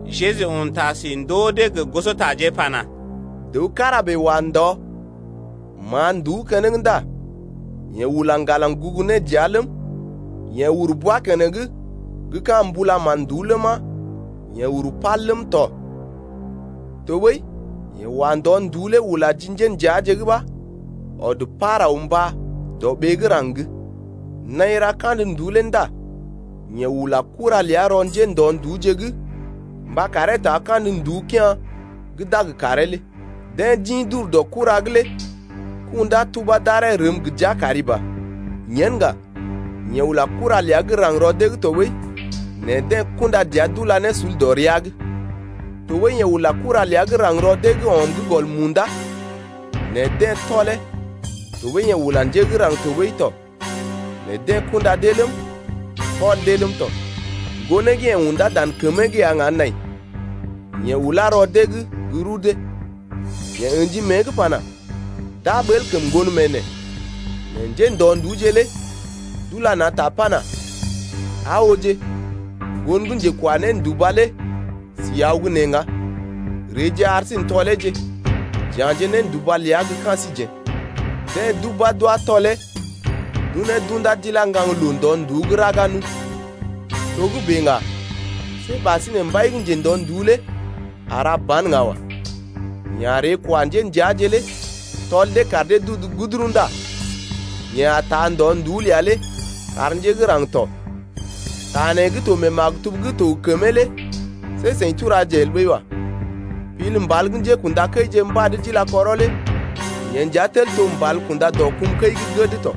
Jeju un ta si ndoo dee gə gosotaje pana: Dəw kára bèe wa ndɔ, ma̰a nduú keneŋ ndá yeḛ ula ŋgalaŋ gugu ne dəa ləm, yeḛ uru bwa keneŋ gə́ ka̰ mbula mán-nduú ləma, yeḛ uru pal ləm tɔ, tɔɓəi yeḛ wa ndɔ-nduú lé ula ji njéndəaje’g ɓa ɔd par aw mbá dɔ ɓee gə́ raŋg. Naḭ ra kandə nduú lé ndá yeḛ ula kura ləa rɔ njéndɔ-nduúje’g mba karee taa kandə nduú kea̰ gə́ d’a gə karee lé. Deḛ d’ḭ d’ur dɔ kura’g lé kundá tubá d’aree rəm gə jia kari ba. Yen ŋga yeḛ ula kura ləa gə́ raŋg rɔ dee’g tɔɓəi, nɛ deḛ kunda dəa d’ula ne sul dɔ rəa’g. Tɔɓəi yeḛ ula kura ləa gə́ raŋg rɔ dee’g ɔm gə́ gɔl munda, nɛ deḛ tɔlee, tɔɓəi yeḛ ula njé gə́ raŋg tɔɓəi tɔ, nɛ deḛ kunda dee ləm, tɔl dee ləm tɔ. Ŋgonee gə́ yeḛ undá dan kəmee’g ya ŋga nai, yeḛ ulá rɔ dee’g gə́ rudee. Yeḛ ə̰ji mée’g pana: D’a ɓəl kəm ŋgon mee neḛ. Nɛ njéndɔ-nduúje lé d’ula na̰ ta pana: Aa ooje, ŋgon gə́ njekwa nénduba lé si aw gə́ nee ŋga, reeje ar sí n’tɔleeje, j’ya̰je ne nénduba ləa gə́ ka̰ síjeḛ. Deḛ d’ubá d’wá tɔlee d’unee d’undá d’ilá ŋgaŋloo ndɔ-nduú’g raga nu. Togə́bè ŋga, see ɓasinè mbai gə́ njendɔ-nduú lé a ra ban ŋga wa. Yeḛ a ree kwa njéndəaje lé tɔl dee kar dee d’udu guduru ndá yeḛ a taa ndɔ-nduú ləa lé kar njé gə́ raŋg tɔ. Ta nee gə́ to mee maktub gə́ to gə kəmee lé see seḭ turaje el ɓəi wa. Pil mbal gə́ njékṵdakəije mbad d’ila kɔrɔ lé Yee nja tel to mbal kunda dɔ kum kəi gə́ gəd tɔ.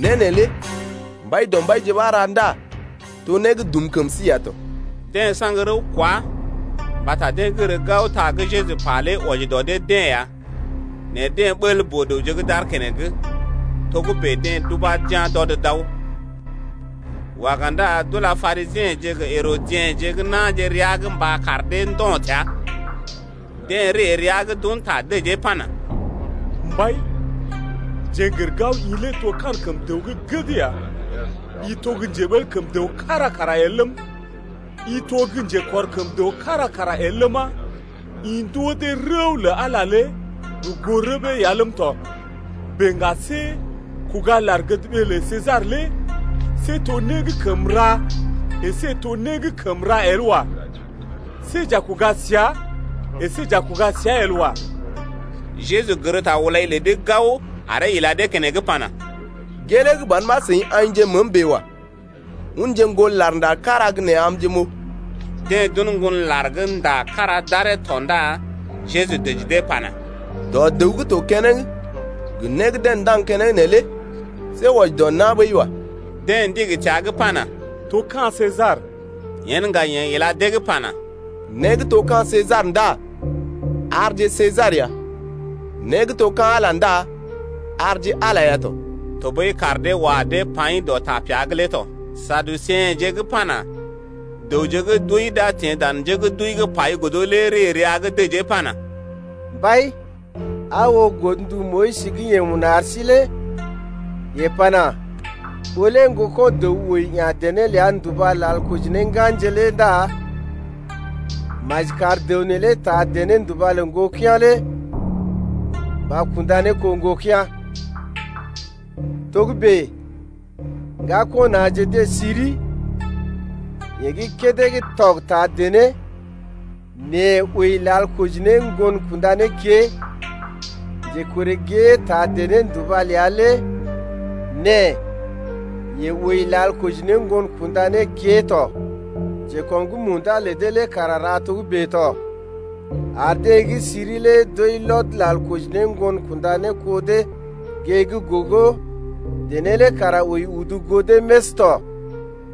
Né neelé Mbaidɔmbaije ɓa ra, Ndá to né gə́ dum kəm sí ya tɔ. Deḛ saŋg rəw kwá mbata deḛ gər gao, ta gə́ Jeju pa lé wɔji dɔ dee-deḛ ya, nɛ deḛ ɓəl boo-dəwje gə́ d’aar keneŋ. Togə́bè deḛ d’ubá d’yá̰ d’ɔd d’aw. Waga ndá d’ula Parisiḛje gə Herodiḛje gə́ na̰je rəa’g mba kar dee ndo̰ təa. Deḛ ree rəa’g d’un ta dəjee pana: Mbai, jeḛ n’gər gao i lé to kankəm dəw gə́ gəd ya, i to gə́ njeɓel kəm dəw kára kara el ləm, i to gə́ njekɔr kəm dəw kára kara el ləma, I ndoo dee rəw lə Ala lé gə goo rəbee ya ləm tɔ. Bèe ŋga see kuga lar-gədɓee lə Sesar lé see to né gə́ kəm ra əsé to né gə́ kəm ra el wa. See j’a kuga səa əsé j’a kuga səa el wa. Jeju gər ta-hulai lə dee gao aree ila dee keneŋ pana: Gelee ban ɓa seḭ aḭje məəm bèe wa. Unje ŋgon lar gə́ ndá kára gə́ nee amje m’oo. Deḛ d’un ŋgon lar gə́ ndá kára d’aree tɔ ndá Jeju dəji dee pana: Dɔ dəw gə́ to keneŋ gə né gə́ deḛ ndaŋg keneŋ neelé see wɔji dɔ na̰ ɓəi wa. Deḛ ndigi təa’g pana: To ka̰ Sesar. Yen ŋga yeḛ ila dee’g pana: Né gə́ to ka̰ Sesar ndá arje Sesar ya, né gə́ to ka̰ Ala ndá arje Ala ya tɔ. Tɔɓəi kaar dee wa dee paḭ dɔ tapea’g lé tɔ. Saduseḛje gə́ pana: Dəwje gə́ d’wəi d’a teḛ dan njé gə́ d’wəi’g pai godo lé ree rəa’g dəjee pana: Mbai, aa oo godndu Moyis gə́ yeḛ un ar sí lé yeḛ pana: Ɓó lé ŋgoko̰ dəw wəi ya̰ dené ləa nduba lal koji ne ŋganje lé ndá maji kar dəw neelé taa dené-nduba lə ŋgokea̰ lé mba kunda ne kó ŋgokea̰. Togə́bè ŋgako̰ na̰je deḛ siri. Yeḛ gə́ kédé gə́ tɔg taa dené nɛ wəi lal koji ne ŋgon kunda ne kée. Njekɔree gée taa dené-nduba ləa lé nɛ yeḛ wəi lal koji ne ŋgon kunda ne kée tɔ. Njekɔm gə́ munda lə dee lé kara ra togə́bè tɔ, ar deḛ gə́ siri lé d’wəi lɔd lal koji ne ŋgon kunda ne kó dee. Gée gə́ gogo dené lé kara wəi udu goo dee més tɔ.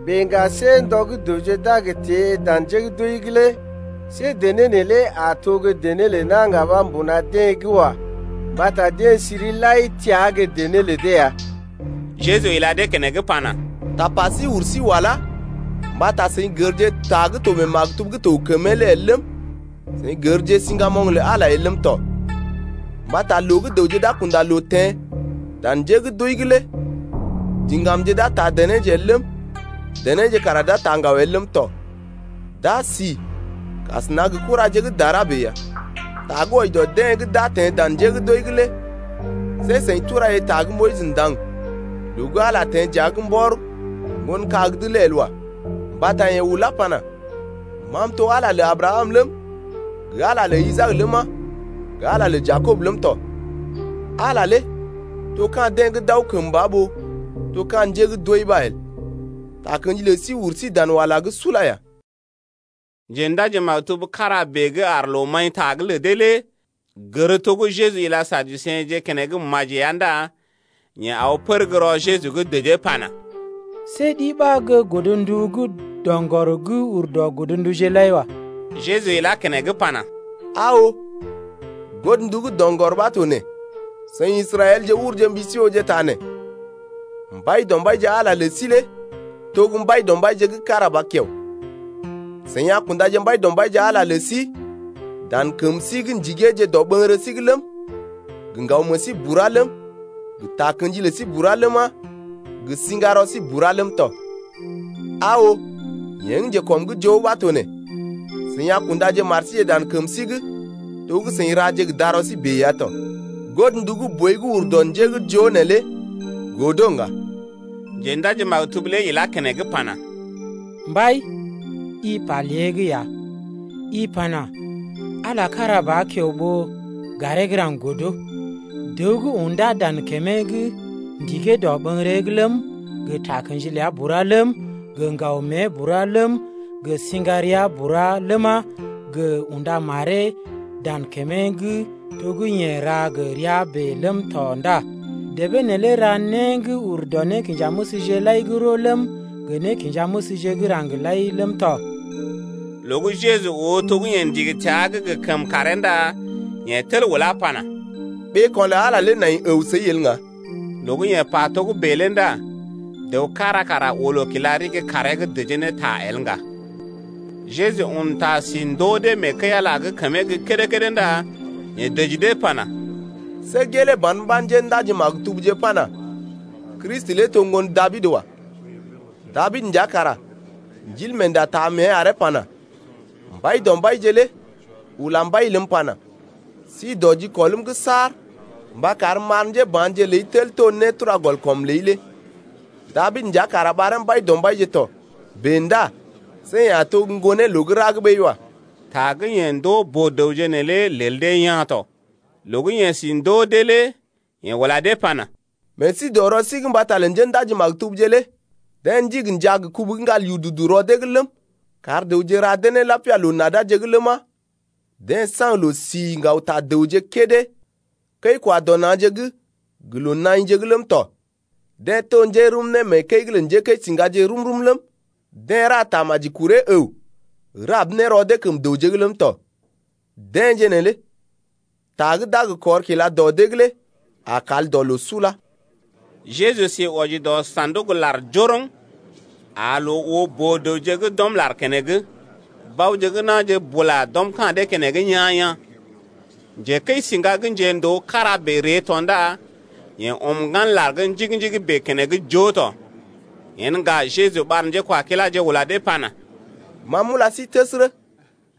Bèe ŋga see ndɔ gə́ dəwje d’a gə teḛ dan njé gə́ d’wəi’g lé see dené neelé a to dené lə na̰ ŋga ɓa mbuna dee’g wa. Mbata deḛ siri lai təa gə́ dené lə dee ya. Jeju ila dee keneŋ pana: Tapa sí ur sí walá mbata seḭ gərje ta gə́ to mee maktub gə́ to gə kəmee lé el ləm, seḭ gərje siŋgamoŋ lə Ala lé el ləm tɔ. Mbata loo gə́ dəwje d’a kunda loo teḛ dan nje gə́ d’wəi’g lé diŋgamje d’a taa denéje el ləm, denéje kara d’a taa ŋgaw el ləm tɔ. D’a sí kasəna gə kuraje gə́ dara bèe ya. Ta gə́ wɔji dɔ deḛ gə́ d’a teḛ dan njé gə́ d’wəi’g lé see seḭ turaje ta gə́ Moyis ndaŋg loo gə́ Ala lé teḛ dəa’g mbɔr ŋgon kag’d lé el wa. Mbata yeḛ ulá pana: Ma m’to Ala lé lə Abrakam ləm, gə Ala lé lə Isaak ləma, gə Ala lé lə Jakob ləm tɔ. Ala lé to ka̰ deḛ gə́ d’aw kəmba ɓó to ka̰ njé gə́ d’wəi ɓa el. Takə̰ji lə sí uru sí dan wala’g sula ya. Njendaji-maktub kára bèe gə́ aar loo-maḭ-ta’g lə dee lé gər to gə́ Jeju ila Saduseḛje keneŋ maji ya ndá yeḛ aw pər gə́ rɔ Jeju’g dəjee pana: See ɗi ɓa gə́ godndu gə́ doŋgɔr gə́ ur dɔ godnduje’g lai wa. Jeju ilá keneŋ pana: Aa oo, godndu gə́ doŋgɔr ɓa to nee: Seḭ Israɛlje urje mbi sí ooje ta nee: Mbaidɔmbaije, Ala lə sí lé to gə́ Mbaidɔmbaije gə́ kára ba kiao. Seḭ a kundaje Mbaidɔmbaije, Ala lə sí dan kəm sí’g ndigeeje dɔɓəŋgərə sí’g ləm, gə ŋgaw meḛ sí bura ləm, gə takə̰ji ləi bura ləma, gə sḭgarɔ sí bura ləm tɔ. Aa oo, yee gə́ njekɔm’g joo ɓa to nee: Seḭ a kundaje mar síje dan kəm sí’g to gə́ seḭ raje gə rɔ sí bèe ya tɔ. Godndu gə́ boi gə́ uru dɔ njé gə́ joo neelé godo ŋga. Njendaji-maktub lé ilá keneŋ pana: Mbai, i pa lée’g ya, i pana: Ala lé kára ba kiao ɓó garee gə́ raŋg godo. Dəw gə́ undá dan kəmee’g ndigee dɔɓəŋgəree’g ləm, gə takə̰ji ləa bura ləm, gə ŋgaw mée bura ləm, gə siŋgarea bura ləma, gə unda maree dan kəmee’g to gə́ yeḛ ra gə rəa bèe ləm tɔ ndá debee neelé ra né gə́ ur dɔ nékinjanéməsje lai gə́ roo ləm, gə nékinjanéməsje gə́ raŋg lai ləm tɔ. Loo gə́ Jeju oo to gə́ yeḛ ndigi təa’g gə kəmkàree ndá yeḛ tel ulá pana: Ɓeeko̰ lə Ala lé nai əw səi el ŋga. Loo gə́ yeḛ pa togə́bè lé ndá dəw kára kara oo loo kila ɗigi kaaree’g dəjee ne ta el ŋga. Jeju un ta si ndoo dee mee kəi-Ala’g kəmee gə́ kédé-kédé ndá yeḛ dəji dee pana: See gelee ban ɓa njéndaji-maktubje pana: Kristi lé to ŋgon Dabid wa. Dabid nja kara Ndilmeenda taa mée aree pana: Mbaidɔmbaije lé ula Mbai ləm pana: Sí dɔ jikɔlm’g saar Mba karm m’ar njéba̰je ləi tel to nétura-gɔl-kɔm ləi lé. Dabid nja kara ɓaree Mbaidɔmbaije tɔ. Bèe ndá see yeḛ a to gə́ ŋgonee loo gə́ ra’g ɓəi wa. Ta gə́ yeḛ ndoo boo-dəwje neelé lel dee yaa̰ tɔ. Loo gə́ yeḛ si ndoo dee lé yeḛ ula dee pana: Meḛ sí dɔ rɔ sí’g mbata lə njéndaji-maktubje lé, deḛ ndigi njaa gə kubu gə́ ŋgal yududu rɔ dee’g ləm, kar dəwje ra dee ne lapia loo-nadaje’g ləma, deḛ saŋg loo-si ŋgaw ta dəwje kédé mee kəi-kwa-dɔ-na̰je’g gə loo-naḭje’g ləm tɔ. Deḛ to njérum né mee kəi’g lə njékəisiŋgaje rum-rum ləm, deḛ ra tamaji kuree əw rab ne rɔ dee kəm dəwje’g ləm tɔ. Deḛje neelé ta gə́ d’a gə kɔr kila dɔ dee’g lé a kal dɔ loo sula. Jeju sí wɔji dɔ sa̰duk-lar njoroŋ, aa loo oo boo-dəwje gə́ d’ɔm lar keneŋ. Baoje gə́ na̰je bula d’ɔm ka̰ dee-deḛ keneŋ yaa̰-yaa̰. Njekəisḭga gə́ njendoo kára bèe ree tɔ ndá yeḛ ɔm ŋgan lar gə́ njigi-njigi bèe keneŋ joo tɔ. Yen ŋga Jeju ɓar njékwakiláje ula dee pana: Ma m’ula sí təsərə,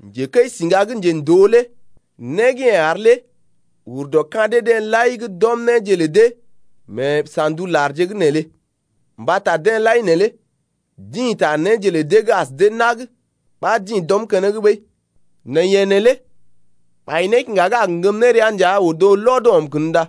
njekəisiŋga gə́ njendoo lé né gə́ yeḛ ar lé ur dɔ ka̰ dee-deḛ lai gə́ d’ɔm néje lə dee mee sa̰duk lar’g neelé. Mbata deḛ lai neelé dḭ ta néje lə dee gə́ as dee nag ɓa dḭ d’ɔm keneŋ ɓəi, nɛ yeḛ neelé bai nékiŋga gə́ a gə ŋgəm ne rəa nja odo lɔd ɔm kən ndá.